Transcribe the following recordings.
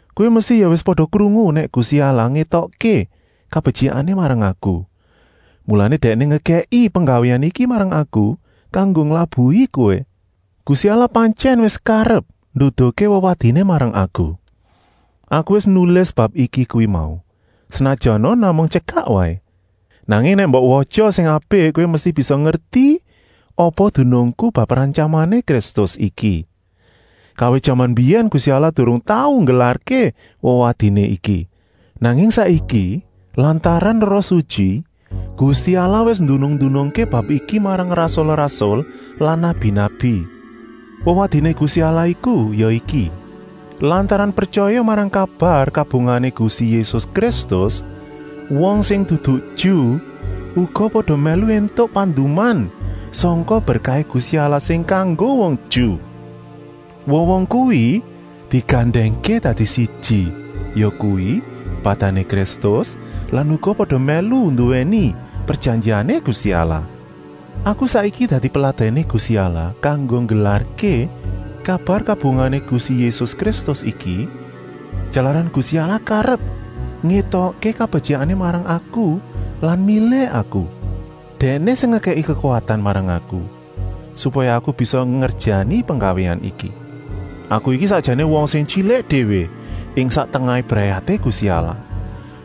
Kowé mesti ya wis pada krungu nèk Gusti Allah ngétokké kabetyikané marang aku, mulané Dèkné ngekèki penggawéan iki marang aku kanggo nglabuhi kowé. Gusti Allah pantyèn wis karep nduduhké wewadiné marang aku. Aku wis nulis bab iki kuwi mau, senajana namung tyekak waé. Nanging nèk mbok watya sing apik kowé mesti bisa ngerti apa dunungku bab rantyamané Kristus iki. Kawit jaman mbiyèn Gusti Allah durung tau nggelarké wewadiné iki, nanging saiki, lantaran Roh Sutyi, Gusti Allah wis ndunung-ndunungké bab iki marang rasul-rasul lan nabi-nabi. Wewadiné Gusti Allah iku ya iki: lantaran pretyaya marang kabar kabungahané Gusti Yésus Kristus wong sing dudu Ju uga pada mèlu éntuk panduman sangka berkahé Gusti Allah sing kanggo wong Ju. Wong-wong kuwi digandèngké dadi siji, yakuwi badané Kristus lan uga pada mèlu nduwèni prejanjiané Gusti Allah. Aku saiki dadi peladèné Gusti Allah kanggo nggelarké kabar kabungahané Gusti Yésus Kristus iki jalaran Gusti Allah karep ngétokké kabetyikané marang aku lan milih aku. Dèkné sing ngekèki kekuwatan marang aku, supaya aku bisa ngerjani penggawéan iki. Aku iki sakjané wong sing tyilik déwé ing sak tengahé brayaté Gusti Allah,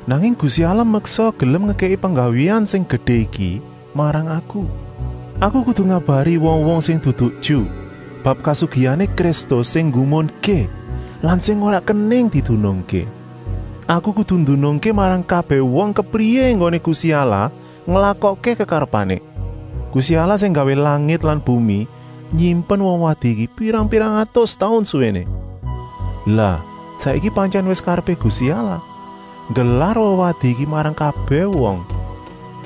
nanging Gusti Allah meksa gelem ngekèki penggawéan sing gedé iki marang aku. Aku kudu ngabari wong-wong sing dudu Ju bab kasugihané Kristus sing nggumunké lan sing ora kenèng didunungké. Aku kudu ndunungké marang kabèh wong kepriyé enggoné Gusti Allah nglakokké kekarepané. Gusti Allah sing nggawé langit lan bumi nyimpen wewadi iki pirang-pirang atus taun suwéné. Lah saiki pantyèn wis karepé Gusti Allah nggelar wewadi iki marang kabèh wong.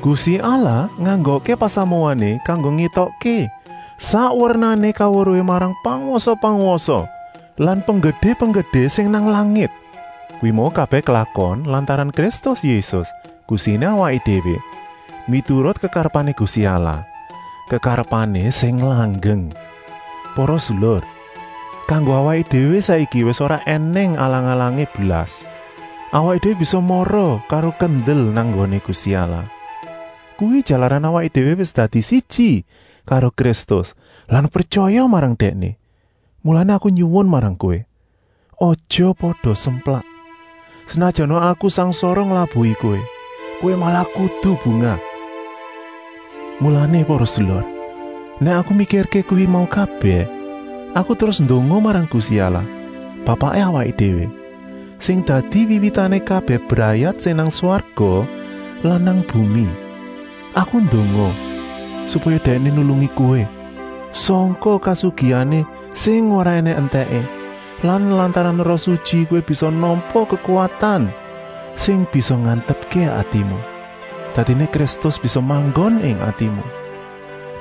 Gusti Allah nganggokké pasamuané kanggo ngétokké sak wernané kaweruhé marang pangwasa-pangwasa lan penggedé-penggedé sing nang langit. Kuwi mau kabèh klakon lantaran Kristus Yésus, Gustiné awaké déwé, miturut kekarepané Gusti Allah, kekarepané sing langgeng. Para sedulur, kanggo awaké déwé saiki wis ora ènèng alang-alangé blas, awaké déwé bisa mara karo kendel nang nggoné Gusti Allah. Kuwi jalaran awaké déwé wis dadi siji karo Kristus lan pretyaya marang Dèkné. Mulané aku nyuwun marang kowé, aja pada semplak, senajana aku sangsara nglabuhi kowé. Kowé malah kudu bungah. Mulané para sedulur, nèk aku mikirké kuwi mau kabèh, aku terus ndonga marang Gusti Allah Bapaké awaké déwé, sing dadi wiwitané kabèh brayat sing nang swarga lan nang bumi. Aku ndonga, supaya Dèkné nulungi kowé sangka kasugihané sing ora ènèng entèké lan lantaran Roh Sutyi kowé bisa nampa kekuwatan sing bisa ngantepké atimu. Dadiné Kristus bisa manggon ing atimu,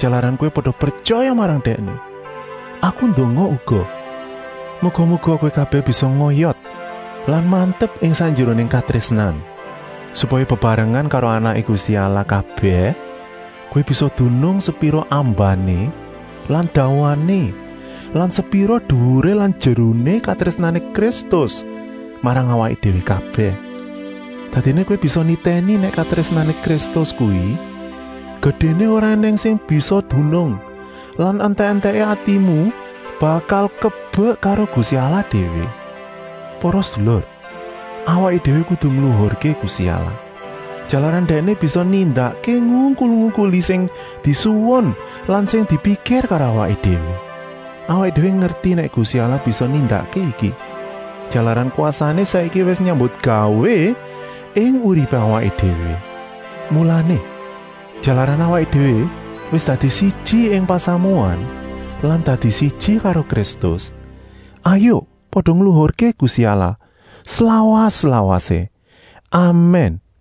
jalaran kowé pada pretyaya marang Dèkné. Aku ndonga uga, muga-muga kowé kabèh bisa ngoyot lan mantep ing sakjeroné katrésnan, supaya bebarengan karo anaké Gusti Allah kabèh kowé bisa dunung sepira ambané lan dawané lan sepira duwuré lan jeruné katrésnané Kristus marang awaké déwé. Dadiné kowé bisa nitèni nèk katrésnané Kristus kuwi gedéné ora ènèng sing bisa dunung lan entèk-entèké atimu bakal kebek karo Gusti Allah déwé. Para sedulur, awaké déwé kudu ngluhurké Gusti Allah, jalaran Dèkné bisa nindakké ngungkul-ungkuli sing disuwun lan sing dipikir karo awaké déwé. Awaké déwé ngerti nèk Gusti Allah bisa nindakké iki, jalaran kwasané saiki wis nyambutgawé ing uripé awaké déwé. Mulané, jalaran awaké déwé wis dadi siji ing pasamuan lan dadi siji karo Kristus, hayuk pada ngluhurké Gusti Allah slawas-lawasé! Amèn.